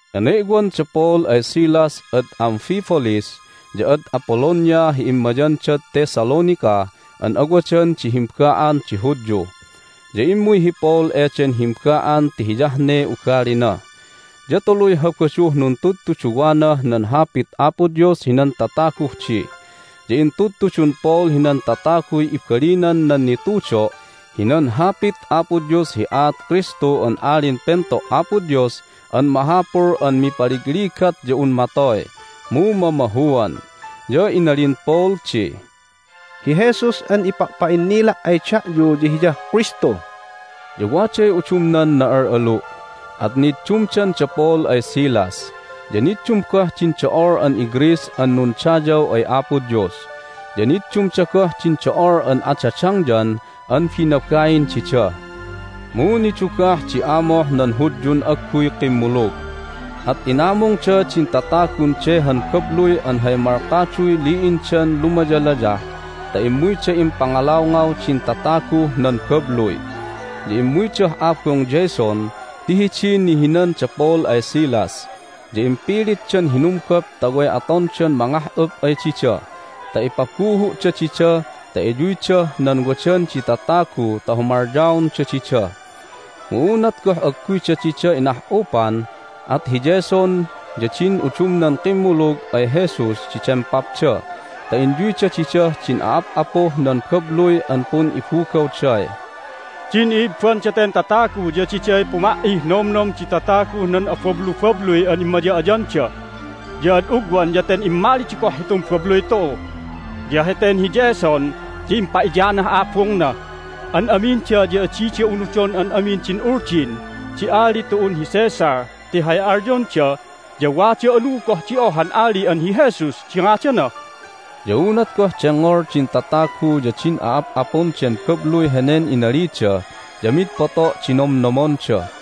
Ene'wan da Paul ay Silas ad Amphipolis ya ad Apollonia hi immayandad Thessalonica an awadan di himba'an di Hudyu. Ya immuy hi Paul eden himba'an ti hiyah ne ugalina, ya tuluy Habaduh nuntudtuduwanah nan Hapit Apo Dios hinan tataguh di. Ya intudtudun Paul hinan tataguy ibalinan nan nitudo' hinan Hapit Apo Dios hi aat Kristu an Alin Pento' Apo Dios an mahapul an mipaligligat ya un matoy, mu mamahuan. Ya inalin Paul di, "Hi Jesus an ipa'pa'innila' ay da'yu ya Hiyah Kristu." Ya waday udumnan na'al'alu', at niddumdan da Paul ay Silas, ya niddum goh din do'ol an iGreece an nundayaw ay Apo Dios, ya niddumda goh din do'ol an adadangyan an binabain dida. Mu nidugah di amoh nan Hudyun agguy kimmulug, at inamungda din tatagun de han babluy an hay malkaduy li'indan lumayalayah ta immuyda impangalawngaw din tataguh nan babluy. Ya immuydah abung Jason ti hidiy nihinan da Paul ay Silas, ya impilitdan hinumgup ta way atondan mangah'up ay dida ta ipabuhu'da dida ta iyuydah nan wadan di tatagu ta humalyaonda dida. Mu unat goh agguyda dida inah'upan at hi Jason ya din udumnan kimmulug ay Jesus di dempapda ta inyuyda didah din a'ap'apuh nan babluy an pun'ibugawday, "Din i'ibban daten tatagu ya diday puma"ih nomnom di tataguh nan abablubabluy an immaya'ayanda! Ya ad ugwan ya ten immalida goh hitun babluy tu'u, ya heten hi Jason ya impa'iyanah abungna! An aminda ya adida unudon an amin din uldin di ali tu'un hi Caesar ti hay alyonda ya wada anu goh di ohan ali an hi Jesus di ngadana!" Ya unat goh dengngol din tatagu ya din a'ap'apun den babluy henen inalida ya mid poto' di nomnomonda.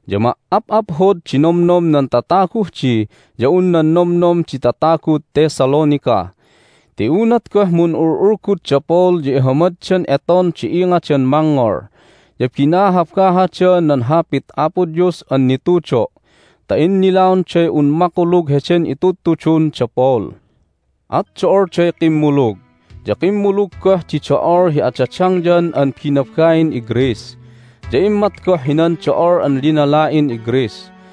Ya ma"ap'aphod di nomnom nan tataguh di ya un nan nomnom di tatagud Thessalonica. Ti unat goh mun'ul'ulgud da Paul ya ihamaddan eton di ingadan mangngol, ya binahabahada nan Hapit Apo Dios an nitudo' ta innilaonday un makulug heden itudutudun da Paul. At do'olday kimmulug, ya kimmulug goh di do'ol hi adadangyan an binabain iGreece, ya immat goh hinan do'ol an linala'in iGreece.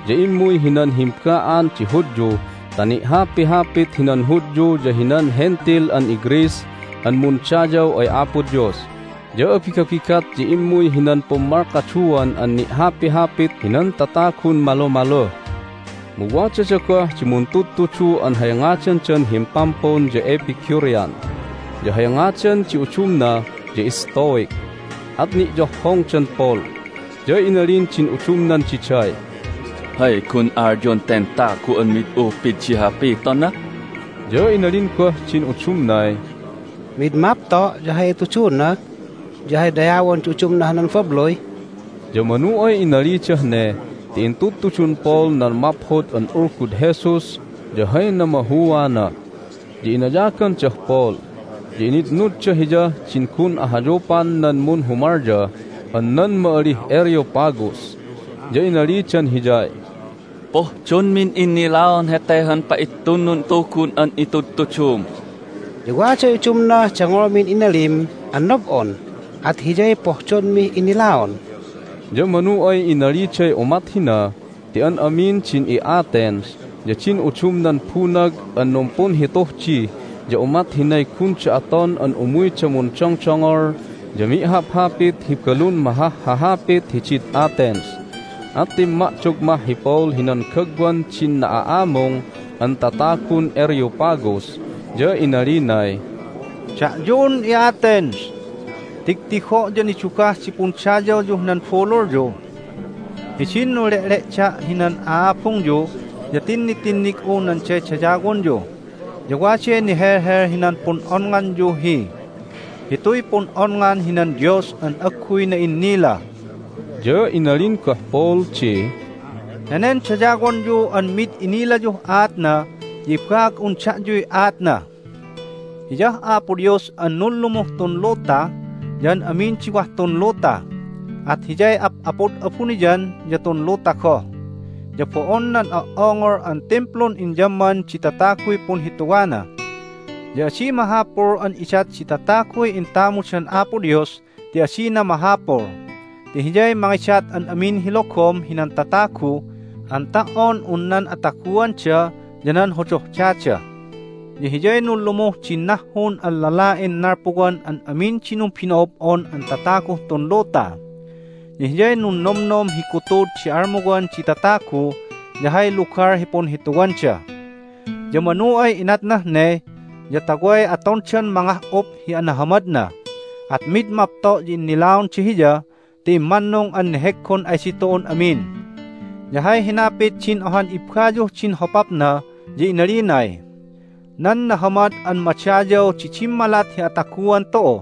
Ya immuy hinan himba'an di Hudyu ta ni'hapihapit hinan Hudyu ya hinan Hentil an iGreece an mundayaw ay Apo Dios. Ya abigabigat ya immuy hinan pummalkaduan an ni'hapihapit hinan tatagun malumaluh. Mu wadada goh di muntudtudu an hay ngadandan himpampun ya Epicurean, ya hay ngadan di udumna ya Stoic, at ni'yohhongdan Paul. Ya inalin din udumnan diday, "Hay gun alyon ten tagu an mid upid di hapitona?" Ya inalin goh din udumnay, "Mid mapto' ya hay ituduna ya hay dayawon di udumnah nan babluy." Ya manu ay inalidah ne ti intudtudun Paul nan Maphod an Ulgud Jesus ya hay namahuana. Ya inayagandah Paul, ya initnudda hiyah din gun ahayupan nan munhumalya an nan ma'alih Areopagus. Ya inalidan hiyay, "Pohdonmin innilaon hete han pa'itunnun tugun an itudtudum. Ya waday udumnah dengngolmin inalim an nob'on, at hiyay pohdonmih innilaon." Ya manu ay inaliday umat hina ti an amin din i'Athens ya din udumnan bunag an numpunhituh di ya umat hinay gunda aton an umuyda mundongdongol ya mi'haphapit hi balun mahahhahapit hidid Athens. At timma'dog mah hi Paul hinan gagwan din na'a'amung an tatagun Areopagus, ya inalinay, "Da'yun i'Athens, tigtigo' ya nidugah di pundayawyuh nan bululyu! Hidin nunle'le'da' hinan a'abungyu ya tinnitinnig'u nan daydayawonyu, ya waday nihelhel hinan pun'onnganyu hi HITUY PUN'ONNGAN HINAN DIOS AN AGGUY NA'INNILA." Ya inalin goh Paul di, "Henen dayawonyu an mid inilayuh aatna ya ibaag'un da'yuy aatna. Hiyah Apo Dios an nunlumuh tun luta ya an amin di wah tun luta, at Hiyay Ap'apud abuniyan ya tun luta goh, ya bo'on nan o"ongol an timplun inyamman di tataguy punhituwana. Ya adi mahapul an idat di tataguy intamudan Apo Dios ti adina mahapul, ti Hiyay mangidat an amin hi logom hinan tatagu an ta"on un nan ataguanda ya nan hodohdada. Ya Hiyay nunlumuh din nahhun an lala'in nalpuwan an amin di numbino'ob'on an tataguh tun luta. Ya Hiyay nunnomnom hi gutud di almuwan di tatagu ya hay lugal hi punhituwanda. Ya manu ay inatnah ne ya ta way atondan mangah'up hi anahamadna, at mid mapto' ya innilaonda Hiya ti immannung an neheggon ay ditu'un amin. Ya hay hinapit din ohan ibbayuh din hopapna ya inalinay, Nan nahamad an madayaw di dimmalat hi ataguan tu'u,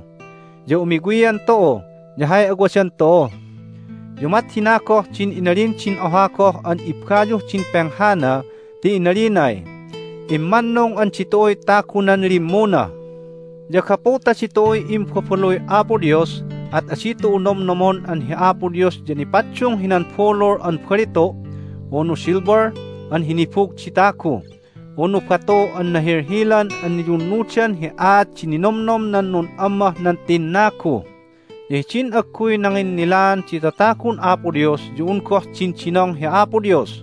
ya umiwian tu'u, ya hay awadan tu'u. Ya umat hina goh din inalin din oha goh an ibbayuh din penghana ti inalinay, Immannung an ditu'uy tagunan limmuna. Ya gapu ta ditu'uy imbabaluy Apo Dios at adi tu'u nomnomon an hi Apo Dios ya nipaddung hinan bulul an balitu', unu silver an hinibug di tagu, unu batu an nahilhilan an niyunnudan hi aat di ninomnom nan nun'ammah nan tinnagu. Ya hidin agguy nanginnilaan di tatagun Apo Dios ya un goh dindinong hi Apo Dios.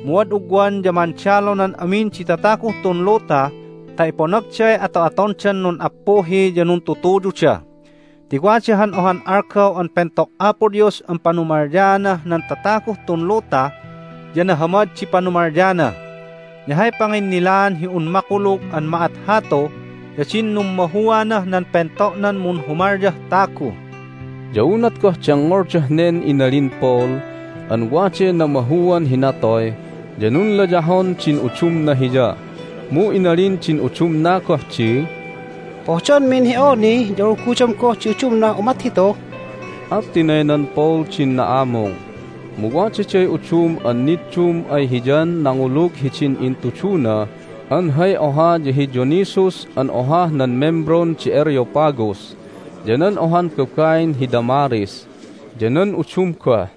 Mu ad ugwan ya mandalonan amin di tataguh tun luta ta iponagday ato'atondan nun'appuhi ya nuntutuyuda. Ti wada han ohan algaw an pento' Apo Dios an panumalyaanah nan tataguh tun luta, ya nahamad di panumalyana. Ya hay panginnilaan hi un makulug an ma'at hatu ya din nummahuanah nan pento'nan munhumalyah tagu." Ya unat goh dengngoldah nen inalin Paul an waday namahuan hi natoy ya nunlayahon din udumna hiya. Mu inalin din udumna goh di, "Pohdonmin hi awni ya ulgudom goh di udumnah umat hitu." At tinaynan Paul din na'amung. Mu wadaday udum an niddum ay hiyan nangulug hidin intuduna an hay oha ya hi Dionysius an ohah nan membron di Areopagus, ya nan ohan babain hi Damaris, ya nan udum goh.